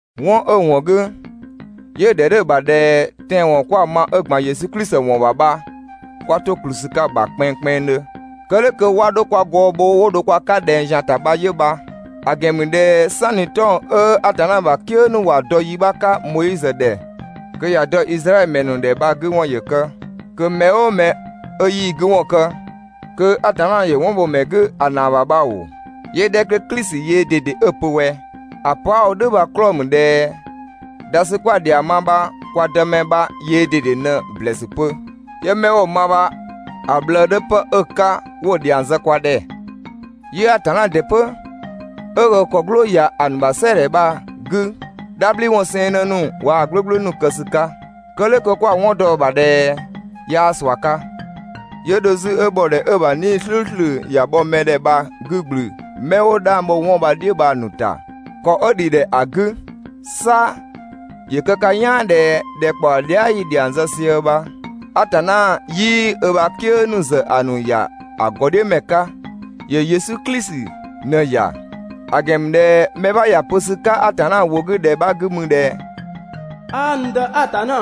'Wɔn 'ö‑ ‑wɔn 'gü 'yö‑ ‑dhɛ 'dhö‑ ‑bha ꞊dhɛ tɛanwɔn 'kwa‑ ma 'ö ‑gban Yesu Klisi ‑wɔn ‑bha bha 'kwa 'to ‑kplü ‑sü 'ka‑ ‑bha kpɛnngkpɛnngdhö, kë "dhʋ̈ kö 'wa 'dho kwa gɔɔ bho 'wo dho kwa 'ka ꞊dhɛng ‑zian ‑ta bha 'yö bha. ‑A ‑gɛn ‑mü ꞊dhɛ "sanni 'tɔng‑ 'ö Atanna ‑bha "kië ‑nu ‑wa dɔ yi 'bha 'ka Moizö ‑dhɛ kö ‑ya dɔ Izraɛdhö ‑mɛ ‑nu ‑dhɛ bha‑ 'gü ‑wɔn ‑yö kë, kö mɛ "ʋʋ mɛ 'ö 'yii‑ 'gü ‑wɔn kë kö Atanna ‑yö 'wɔn bho‑ ‑mɛ 'gü ‑a ‑naa ‑bha bha ‑oo, 'yö‑ 'dhɛ 'kö Klisi yöö ꞊dede 'ö‑ pö ꞊wɛ? ‑A pö 'a‑ wo "dhʋ̈ bha‑ 'klɔɔ‑ ‑mü ꞊dhɛ dha ‑sü 'kwa‑ ‑dhiang ma bha kwa Dëmɛ bha yöö ꞊dede ꞊në‑ ‑blɛɛsü pö, 'yö 'mɛ 'wo‑ ma bha, ‑a ꞊bhlëë 'dhö 'pë 'ö‑ 'ka 'wo‑ ‑dhiang zë kwa ‑dhɛ. 'Yö Atanna ‑dɩ 'pö 'ö ö ‑kɔ "gblʋʋ ‑ya ‑a ‑nu ‑bha "sɛɛ‑ ‑dhɛ bha‑ 'gü "dhabhliwɔn 'sɛɛnnë ‑nu waa‑ "gblʋ̈gblʋ̈ ‑nu kë ‑sü 'ka. Kë "dhʋ̈ kö 'kwa‑ 'wɔn dɔ‑ ‑bha ꞊dhɛ 'yaa ꞊sua 'ka. 'Yö dho 'zü 'ö ‑bhɔdhɛ 'ö‑ ‑bha 'Nii‑ "slʋ̈ʋ̈slʋ̈ ‑ya bhɔ mɛ ‑dhɛ bha‑ 'gü ‑gblü 'mɛ 'wo 'dhang bho 'wɔn bha‑ "dhiʋ̈ bha‑ ‑nu ‑ta ‑kɔ 'ö ‑dhi ‑dhɛ ‑a 'gü. 'Sa ‑yö kë ka "yaan ꞊dhɛ ‑dhɛkpaɔ dhia" yi‑ ‑dhiang zë sië bha, Atanna 'yii ö ‑bha "kië ‑nu ‑zë ‑a ‑nu ‑ya ‑a ‑gɔdhiʋ̈ ‑mɛ 'ka, ‑yö Yesu Klisi ꞊në‑ ‑ya. ‑A ‑gɛn ‑mü ꞊dhɛ mɛ 'bha ‑ya pö ‑sü 'ka Atanna ‑wʋ 'gü ‑dhɛ 'bha 'gü mü ꞊dhɛ: «'Aa n Dë Atanna,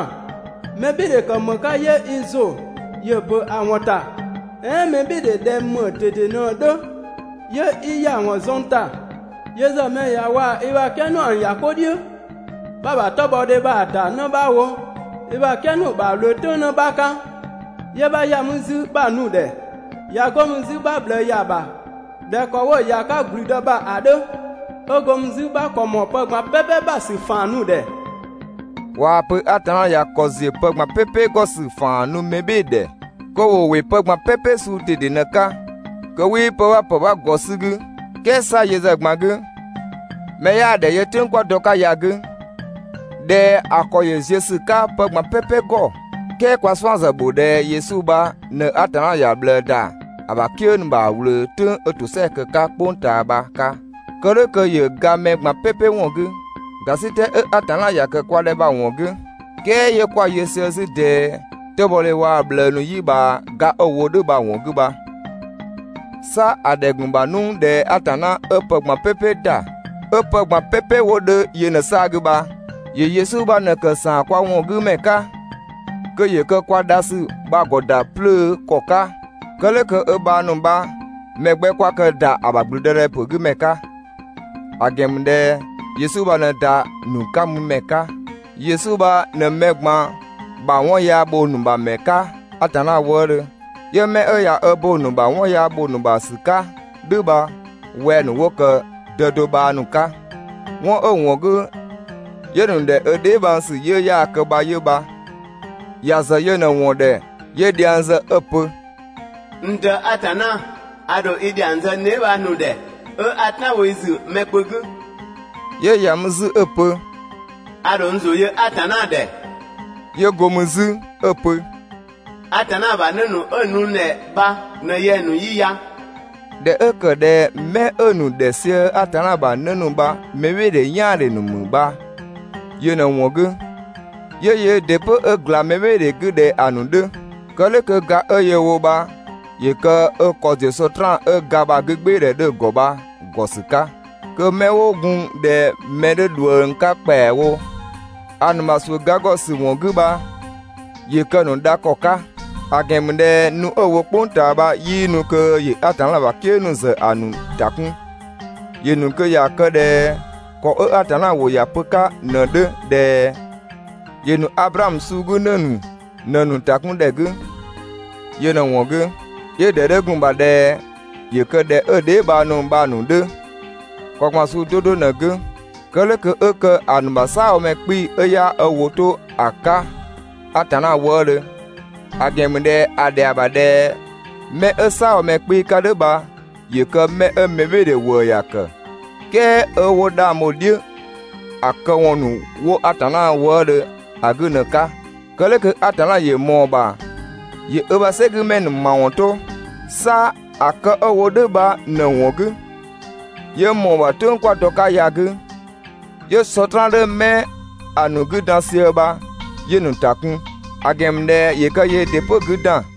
mɛbhɩɩdhe ‑kë ‑më 'ka 'yö i ‑zʋ ‑yö ‑bö ‑a ‑wɔn ‑ta? "Ɛɛn mɛbhɩɩdhe ꞊dhɛ ‑më ꞊dede ꞊në‑ 'dhö 'yö 'i ‑ya ‑wɔn zuën ‑ta? Yö ‑zë mɛ ꞊ya waa‑ i ‑bha "kië ‑nu ‑a ‑nu ‑ya 'ko "dhiʋ̈, 'bha‑ ‑bha 'tɔbhɔdhe bha‑ ‑da 'në 'bha ‑wo i ‑bha "kië ‑nu ‑bha ꞊wlöö "tʋ̈ng 'në 'bha 'ka, 'yö 'bha ‑ya mü 'zü 'bha‑ nu‑ ‑dhɛ, ꞊ya 'go mü 'zü 'bha ꞊bhlëë ‑ya ‑bha ꞊dhɛ ‑kɔ 'wo‑ ‑ya 'ka ‑gblüdë ‑bha ‑a 'dhö, 'ö go mü 'zü 'bha ‑kɔ ‑mɔɔ pë ꞊gban "pɛpɛ ‑bha ‑sü ‑faan nu‑ ‑dhɛ.» ꞊Waa‑ pö Atanna ꞊ya ‑kɔ ‑ziö pë ꞊gban "pɛpɛ ‑gɔ ‑sü ‑faan nu mɛ "bhɩɩ‑ ‑dhɛ, kö ‑wo ‑wɩ pë ꞊gban "pɛpɛ suu ꞊dede ꞊në‑ 'ka, kö 'wii pë 'bha ‑pë 'bha ‑gɔ 'sü‑ 'gü. "Kɛɛ 'sa yö ‑zë ꞊gban 'gü mɛ 'yaa‑ ‑dhɛ yö "tʋ̈ng 'kö 'kwa dɔ‑ 'ka ya‑ 'gü ꞊dhɛ ‑a ‑kɔ ‑yö ziö ‑sü 'ka pë ꞊gban "pɛpɛ ‑gɔ. "Kɛɛ kwa‑ 'suan‑ ‑zë bho ꞊dhɛ Yesu bha ꞊në Atanna ‑ya ꞊bhlëë ‑da ö ‑bha "kië ‑nu ‑bha ꞊wlöö "tʋ̈ng 'ö ‑tosɛa kë‑ 'ka "kpʋng ꞊taa bha‑ 'ka. Kë "dhʋ̈ kö ‑yö ga mɛ ꞊gban "pɛpɛ ‑wɔn 'gü, ‑gasitɛ 'ö Atanna ‑ya ‑kë kwa ‑dhɛ bha‑ ‑wɔn 'gü, "kɛɛ 'yö 'kwa‑ yö sië 'zü ꞊dɛɛ 'tɔbhɔdhe waa‑ ꞊bhlëë ‑nu "yi ꞊bhaa ga 'ö‑ wo "dhʋ̈ bha‑ ‑wɔn 'gü bha. 'Sa ‑a ‑dhɛ ‑gun ‑bha 'nu ꞊dhɛ Atanna 'ö pë ꞊gban "pɛpɛ ‑da, 'ö pë ꞊gban "pɛpɛ 'wo 'dhö yö ꞊në‑ 'saa‑ 'gü bha, ‑yö Yesu bha ꞊në‑ kë ‑saan kwa ‑wɔn 'gü ‑mɛ 'ka. Kö ‑yö kë kwa dha ‑sü bha‑ ‑gɔ ‑da 'plöö ‑kɔ 'ka. Kë "dhʋ̈ kö ö bhang ‑nu bha‑ mɛ 'gbɛ 'kwa kë ‑da ‑a ‑bha ‑gblüdëdhɛpö 'gü ‑mɛ 'ka, ‑a ‑gɛn ‑mü ꞊dhɛ Yesu bha ꞊në ‑da ‑nu 'ka mü ‑mɛ 'ka. Yesu bha ꞊në mɛ ꞊gban ‑bha 'wɔn yaa ‑bho ‑nu ‑bha ‑mɛ 'ka Atanna wëëdhö, 'yö 'mɛ 'ö ꞊ya bo ‑a ‑nu ‑bha 'wɔn yaa ‑bho ‑nu ‑bha ‑sü 'ka "dhʋ̈ bha wɛng‑ ‑nu 'wo ‑kë Dë do bhang ‑nu 'ka. 'Wɔn 'ö‑ ‑wɔn 'gü, 'yö‑ ‑nu ‑dhɛ 'ö dheebhang ‑sü 'yiʋ̈‑ 'yaa‑ kë bha 'yö bha. ‑Ya ‑zë yö ꞊në‑ ‑wɔn ‑dhɛ 'yö dhiang zë 'ö‑ pö: «N Dë Atanna a ‑dho i ‑dhiang zë n dheebhang ‑nu ‑dhɛ, 'ö 'a "tan bho i ‑zü mɛ kpö 'gü.» 'Yö ‑ya mü 'zü 'ö‑ pö: «A ‑dho n ‑zʋ yö Atanna ‑dhɛ.» 'Yö go mü 'zü 'ö‑ pö: «Atanna ‑bha 'në ‑nu 'ö‑ nu n ‑dhɛ bha ꞊në yɛng‑ ‑nu 'yi ya.» ꞊Dhɛ 'ö ‑kë ꞊dhɛ 'mɛ 'ö‑ ‑nu ‑dhɛ sië Atanna ‑bha 'në ‑nu bha mɛbhɩɩdhe "yaan‑ ‑dhe ‑nu ‑mü bha yö ꞊në‑ ‑wɔn 'gü, 'yö yöö ‑dɩ 'pö 'ö ‑gla mɛ "bhɩɩ‑ 'gü ꞊dhɛ ‑a ‑nu 'dhö. Kë "dhʋ̈ kö ga 'ö yöö‑ wo bha, ‑yö kë ö ‑kɔ ‑ziö Sɔtraan 'ö ‑ga ‑bha 'gügbɩɩdhɛ 'dhö‑ ‑gɔ bha‑ ‑gɔ ‑sü 'ka, kö 'mɛ 'wo gun ꞊dhɛ mɛ 'dhö ꞊dhuëng 'ka ‑kpɛawo ‑a ‑nu ‑bha ‑suʋ̈ ga ‑gɔ ‑sü ‑wɔn 'gü bha, ‑yö kë‑ ‑nu dha ‑kɔ 'ka. ‑A ‑gɛn ‑mü ꞊dhɛ nu 'ö‑ wo "kpʋng ꞊taa bha 'yii nu kö ‑yö Atanna ‑bha "kië ‑nu ‑zë ‑a ‑nu ‑ta 'kun. ‑Yö ‑nu kö ‑ya kë ꞊dhɛ ‑kɔ 'ö Atanna ‑wʋ ‑ya pö‑ 'ka ꞊në‑ 'dhö ꞊dhɛ: ‑Yö ‑nu Ablaamö suu 'gü ‑në ‑nu ꞊në‑ ‑nu ‑ta 'kun ‑dhɛ 'gü. Yö ꞊në‑ ‑wɔn 'gü, 'yö‑ ‑dhɛ 'dhö gun‑ ‑bha ꞊dhɛ ‑yö kë ꞊dhɛ ö dheebhang ‑nu bha‑ ‑nu 'dhö ‑kɔ ꞊gban suu 'do 'do ꞊në‑ 'gü. Kë "dhʋ̈ kö 'ö kë ‑a ‑nu ‑bha "saabhomɛ 'kpii‑ 'ö 'yaa ö ‑wʋ 'to ‑a 'ka Atanna wëëdhö, ‑a ‑gɛn ‑mü ꞊dhɛ ‑a ‑dhɛa ‑bha ꞊dhɛ 'mɛ 'ö "saabhomɛ 'kpii‑ 'ka "dhʋ̈ bha ‑yö kë 'mɛ 'ö mɛbhɩɩdhe ‑wëë ‑ya ‑kë, "kɛɛ 'ö 'wo 'dhang bho‑ "dhiʋ̈ ‑a këwɔn ‑nu 'wo Atanna wëëdhö ‑a 'gü ꞊në‑ 'ka. Kë "dhʋ̈ kö Atanna ‑yö ꞊mɔɔ‑ ‑bha ‑yö ö ‑bha "sɛgümɛ ‑nu ‑mawɔn 'to. 'Sa ‑a kë 'ö‑ wo "dhʋ̈ bha ꞊në‑ ‑wɔn 'gü, 'yö ꞊mɔɔ‑ ‑bha "tʋ̈ng 'kwa dɔ‑ 'ka ya‑ 'gü, 'yö Sɔtraan 'dhö 'mɛ ‑a ‑nu 'gü dan sië bha, 'yö‑ ‑nu ‑ta kun, ‑a ‑gɛn ‑mü ꞊dhɛ ‑yö kë yöö ‑dɩ 'pö‑ 'gü ‑dan.